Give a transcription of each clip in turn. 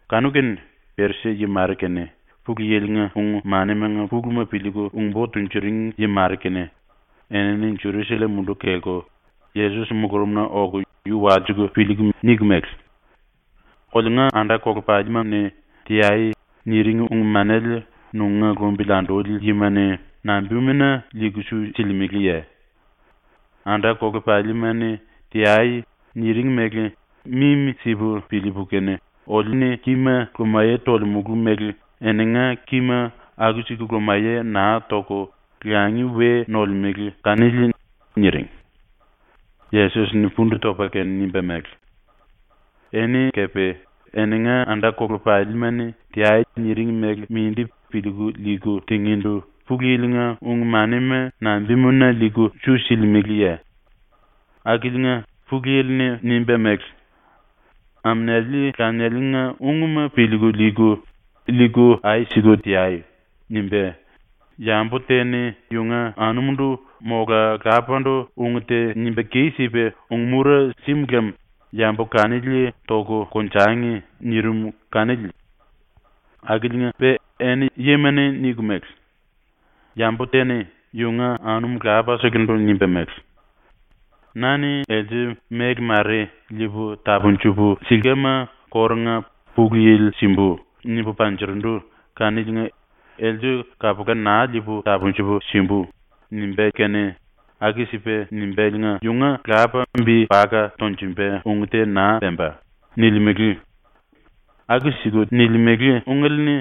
Kanu-kene Perisi-yi mare kene, Pulu Yili-nga ung-manimanga puluma piliiku ung-bo tunjuring yi mare kene enini Jerusallem munduku kelku Yesos mulurumna oku yu walsiku piliiku niku mele: “Oliunga anda-kolepalima-ni “Teai.” niring ung-manele nunga lumbili anduli yima-ni nambimuna liiku su silimeleye? ⸤Anda-kolepalima-ni “Teai.” niring mele mimi-sipu piliipu kene oliu-ni kíma lumaye tolemulu mele⸥ eninga kíma aku-siku lumaye naa toku langi we nolemele kanili.” niring. Yesos-ni pundu topa kene nimba mele: “Eni kepe eninga anda-kolepalima-ni “Teai.” niring mele mindi piliiku liiku tingíndu Pulu Yili-nga ung-manima nambimuna liiku su silimeleye? Akiliinga Pulu Yili-ni nimba mele: “Aminiali lanialinga ungma piliiku liiku, liiku ai siku teai.” nimba “Yambu te-ni yunga anumundu mola lapandu ung te nimba kis-sipa ung-mura sim lem yambu kanili toku konjangi.” nirim kanili. Akiliinga-pe eni yima-ni niku mele: “Yambu te-ni yunga anum lapaselendu nimba mele: “Na-ni else méle mare liipu tapunjupu silkama kórunga ‘Pulu Yili simbu.’ nimbu panjurundu kaniliinga else kapula naa liipu tapunjupu simbu.” nimbá kene ⸤aku-sipa nimbáliinga⸥ yunga lapa bi paka tonjumba ung te naa pemba.” nilimele. Aku-siku nilimele ungele-ni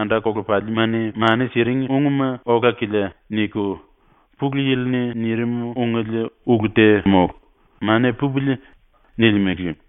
‘Anda-kolepalima-ni mani siring ungma ola-kilia.’ niku ‘Pulu Yili-ni nirim ungele ulu te mólu. Mania pupili.’ nilimele.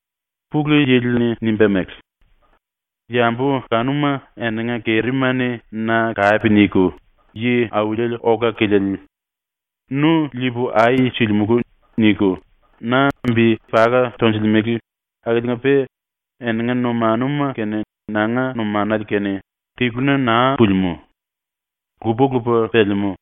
‘⸤Pulu Yili-ni nimba mele:⸥ “Yambu kanuma eninga kerima-ni na kape niku ‘Yi auli ola-kiliele. Nu liipu ai silimulu.’ niku na bi paka tonjilimele akiliinga-pe eninga numanuma kene nanga numanale kene tiluna naa pulimú. Lupa-lupa pelemú.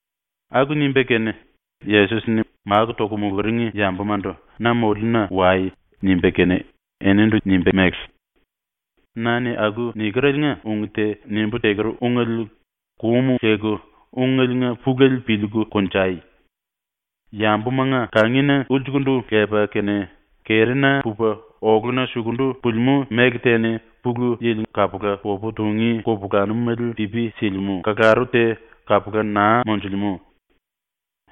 Aku nimba kene Yesos-ni máku toku muluring yambumandu “Na moliuna wai.” nimba kene eninindu nimba mele: “Na-ni ⸤aku nikereliinga ung te⸥ nimbú teker ungele kum leku ungeliinga pulele piliiku konjai. Yambumanga kangina ulsukundu lepa kene kerina pupa oluna sukundu pulimú méle te-ni ⸤Pulu Yili kapula popu tungí kupulanumele pipi silimú⸥ kalaru te kapula naa monjulemú.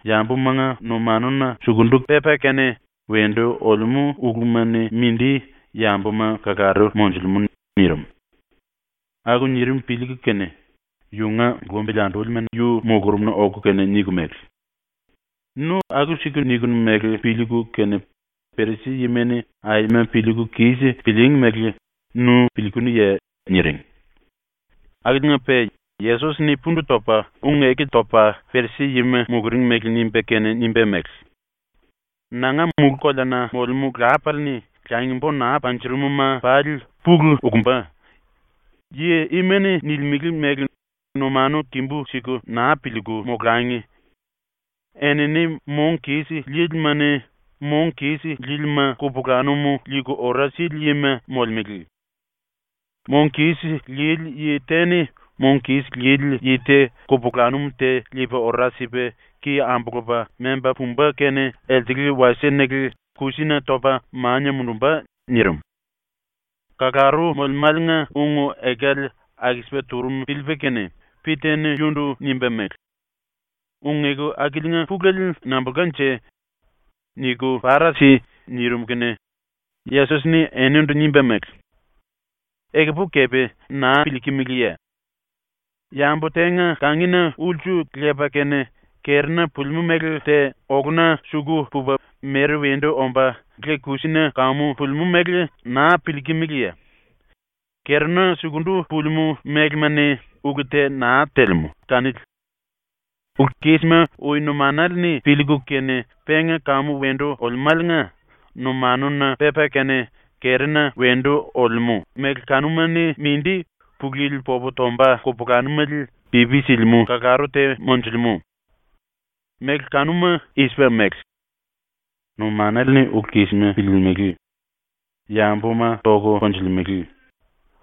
Yambumanga numanuna sukundu pepa kene wendu olemú uluma-ni mindi yambuma kalaru monjulemú.” nirim. Aku nirim piliiku kene, yunga lumbili andúlima yu mulurumna oku kene niku mele: “Nu aku-siku nikinu mele piliiku kene Perisi-yima-ni aima piliiku kis pilííngi mele nu piliikunuye?” niring. Akiliinga-pe Yesos-ni pundu topa ⸤ung-eku topa Perisi-yima muluring mele nimba kene⸥ nimba mele: “Nanga mulú-koleana molemú Lapale-ni langi-bo naa panjurum-ma pali pulu ukumba. Yi ima-ni nilimele mele numanu kimbu-siku naa piliiku molangi. Enini mong kis lílima-ni ⸤mong kis lílima⸥ kupulanum liiku ora sili yima molemele. Mong kis lili yi te-ni mong kis lili yi te kupulanum te liipa ora sipa ki ambulupa memba pumba kene elsele wasie-nele kusina topa mania mundumba.” nirim. ⸤Kalaru molemáliinga ung-ekale aku-sipa turum piliipa kene⸥ Pita-ni yunundu nimba mele: “Ung-eku akiliinga pulele nambulkanje? Niku para si.” nirim kene Yesos-ni eninindu nimba mele: “Ekupu kepe naa piliikimiliye? Yambu tenga kangina ulsu lepa kene kerina pulimú méle te oluna suku pupa mere wendu omba le-kusina kamu pulimú mele naa piliikimiliye? ⸤Kerina sukundu pulimú mélema-ni ulu te naa telemú kanili.⸥ Ulu-kísima ui numanale-ni piliiku kene penga kamu wendu olemáliinga numanuna pepa kene kerina wendu olemú méle kanuma-ni mindi ⸤Pulu Yili popu tomba kupulanumele pipi silimú⸥ kalaru te monjulemú. Méle kanuma i-sipa mele: Numanale-ni ulu-kísima piliilimili, yambuma toku konjulemele,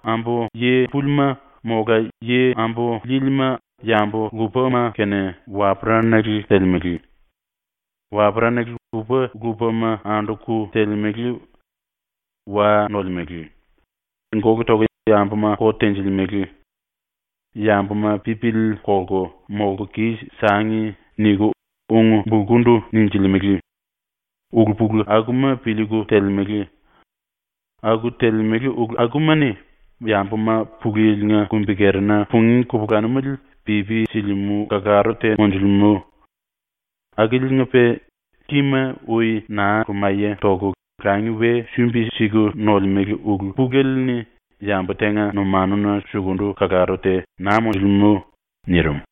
ambu yi púlima mola yi ambu líílima yambu lupama kene waperanale telemele, waperanale lupa-lupama anduku telemele, wa nolemele, gólu toku yambuma kot tenjilimele, ‘Yambuma pipili kolku molku kis-sangi.’ niku ung-bulkundu ninjilimele, ulu-pulu akuma piliiku telemele. Aku telemele ulu akuma-ni yambuma ⸤Pulu Yili-nga kumbi-kerina pungí kupulanumele pipi silimú⸥ kalaru te monjulemú. Akiliinga-pe kima ui naa lumaye toku langi we sumbi-siku nolemele ulu pulele-ni ⸤yambu tenga numanuna suku⸥ kalaru te naa monjulemú.” nirim.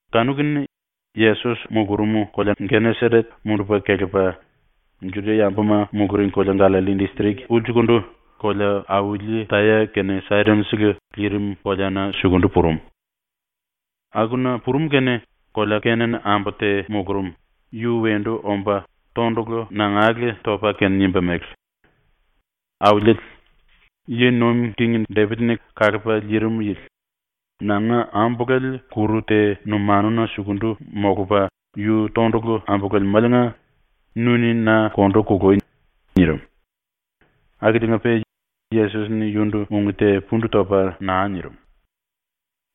Kanu-kene Yesos mulurum kolea ⸤Geneseret⸥ mundupa kelepa ⸤Juda-yambuma muluring kolea Gallalli distrik ulsukundu⸥ kolea-auli Taya kene Saidon-sele lirim koleana suku purum. Akuna purum kene kolea Kenan ambu te mulurum, yu wendu omba tondulu nangale topa kene nimba mele: “Auliele, Yi Nuim King Depit-ni Kalupa Liirim Yili, nanga ambulale kuru te numanuna sukundu molupa yu tondulu ambululemáliinga nu-ni na kondu kului!” nirim. Akiliinga-pe Yesos-ni yunundu ung te pundu topa naa nirim.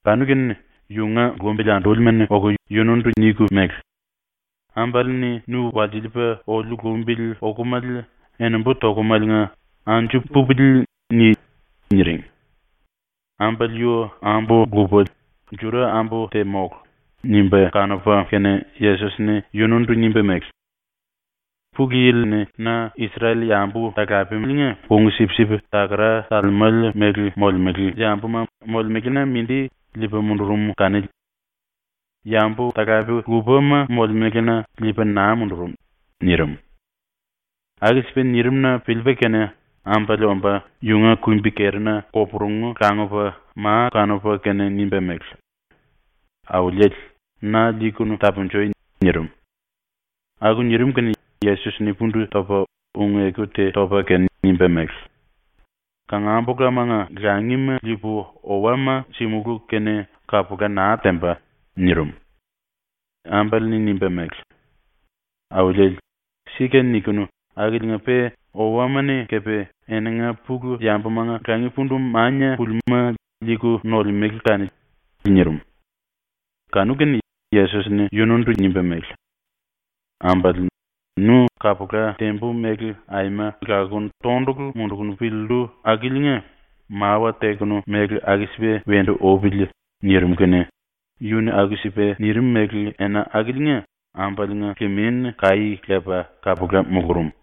Kanu-kene yunga lumbili andúlima-ni oku yunundu niku mele: “Ambale-ni nu walsiliipa oliu lumbili okomale ⸤enembu tokum⸥aliinga ‘Anju pupili.’ ni.” niring. ⸤Ambale yu ambu-lupa, Juda-ambu te mólu, nimba kanupa kene⸥ Yesos-ni ⸤yunundu⸥ nimba mele: “Pulu Yili-ni na Isrel-yambu talapeliinga kung-sipsip takara talemele mele molemele yambuma molemelena mindi liipa mundurum kanili. Yambu talape lupama molemelena liipa naa mundurum.” nirim. Aku-sipa nirim-na piliipa kene ambale omba yunga kumbi-kerina koporungu langupa ma kanupa kene nimba mele: “Auliele, na liikunu tapunjui.” nirim. Aku nirim kene Yesos-ni pundu topa ⸤ung-eku te topa kene⸥ nimba mele: “Kangambulamanga langima liipu owama simulú kene kapula naa temba.” nirim. Ambale-ni nimba mele: “Auliele, sika nikinu akiliinga-pe owama-ni kepe eninga pulu-yambumanga langi pundu mania pulimúma liiku nolemele kanili.” nirim. Kanu-kene Yesos-ni yunundu nimba mele: “Ambale, nu kapula tembu mele aima lakuku tondulu munduku piliillu akiliinga mawa tekenu mele aku-sipa wendu upili.” nirim kene yu-ni aku-sipa nirim mele ena akiliinga ambaliinga limin kaí lepa kapula mulurum.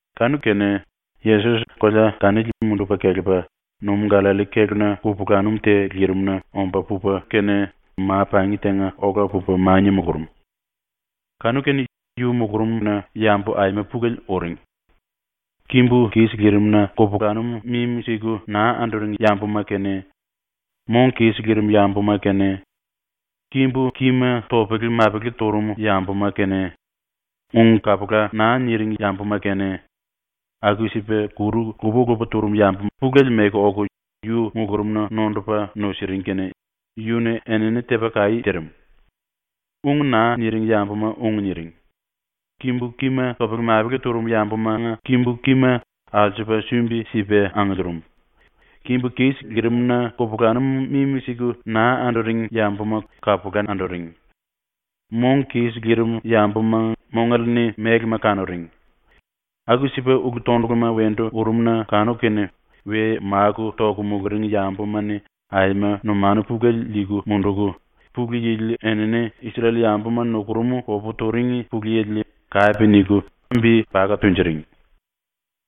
Kanu-kene Yesos kolea kanili mundupa kelepa numú-Gallalli kéluna ⸤kupulanum te lirimna⸥ omba pupa ma-pangi tenga ola pupa mania mulurum. Kanu-kene yu mulurumna yambu aima pulele uring. Kimbu kis lirim-na kupulanum mimi-siku naa anduring yambuma kene, mong kis lirim yambuma kene, kimbu-kima topele-mapele turum yambuma kene, ung kapula naa niring yambuma kene, aku-sipa kuru lupa-lupa turum yambu pulele meku oku yu mulurumna nondupa nusiring kene yu-ni enini tepa kaí tirim. Ung naa niring yambuma ung niring; kimbu kima topele-mapele turum yambumanga kimbu kima alsupa sumbi-sipa angiliirim; kimbu kis lirim-na kupulanum mimi-siku naa anduring yambuma kapula anduring; mong kis lirim yambuma mongale-ni mélema kanuring; aku-sipa ulu-tonduluma wendu urum-na kanuku kene we máku toku muluring yambuma-ni aima numanu pulele liiku munduku, Pulu Yili enini Isrel-yambuma nukurum popu turing Pulu Yili kape niku bi paka tunjuring.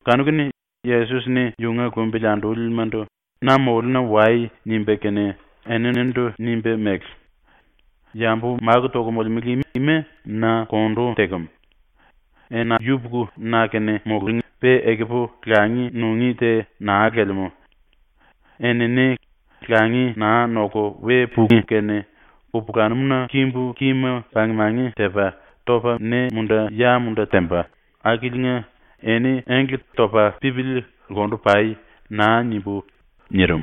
Kanu-kene Yesos-ni yunga lumbili andúlimandu “Na moliuna wai.” nimba kene eninindu nimba mele: “Yambu máku toku molemele ima na kondu tekem. Ena yupuku na-kene mulúngi, pe ekupu langi nungí te naa lelemú. Enini langi naa noku we pungí kene kupulanum-na kimbu kima pang-mangi tepa, topa ne-munda ya-munda temba akiliinga ‘Eni engle topa pípili lkundu pai.’ naa nimbú.” nirim.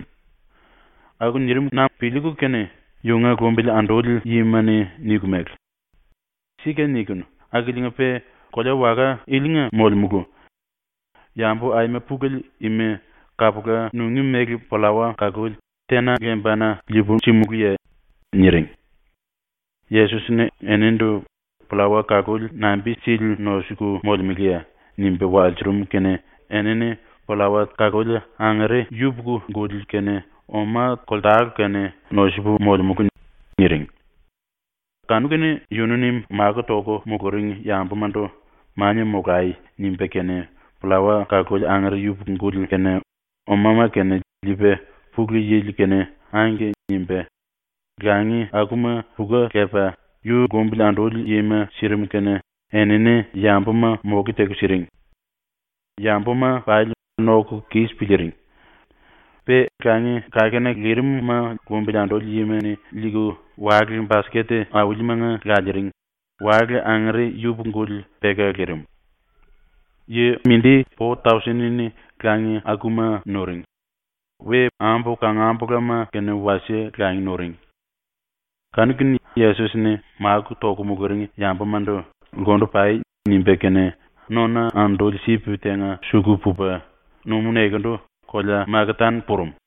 Aku nirim kene-na piliiku kene yunga lumbili anduli yima-ni niku mele: “⸤Sika nikinu akiliinga-pe⸥ kolea-waka ilinga molemulu. Yambu aima pulele ima kapula nungí mele pllawa kaluli tena lembana liipu simulúye?” niring. Yesos-ni eninindu “Pllawa kaluli nambi-sili nosuku molemeleye?” nimba walsurum kene enini “Pllawa kaluli angere yupuku-guli kene oma koltale kene nosupu molemulu.” niring. Kanu-kene yunu-ni máku toku muluring yambumandu “Mania molai.” nimba kene, pllawa kaluli angere yupuku-guli kene omama kene liipa Pulu Yili-kene “Angke” nimba, langi akuma puka lepa yu lumbili anduli yima sirim kene enini yambuma moke teku siring. Yambuma pali noku kis piliiring. Pe langi-kakena lirim-ma lumbili anduli yima-ni liiku wale-basket aulimanga laliiring, wale angere yupuku-guli peka lirim. Yi po-tausen-ni langi akuma nuring. Ambu kangambulama kene wasie langi nuring. Kanu-kene Yesos-ni máku toku muluring yambumandu “Lkundu pai.” nimba kene, nona-anduli-sip tenga suku pupa, ⸤numú nekendu⸥ kolea Makatan purum.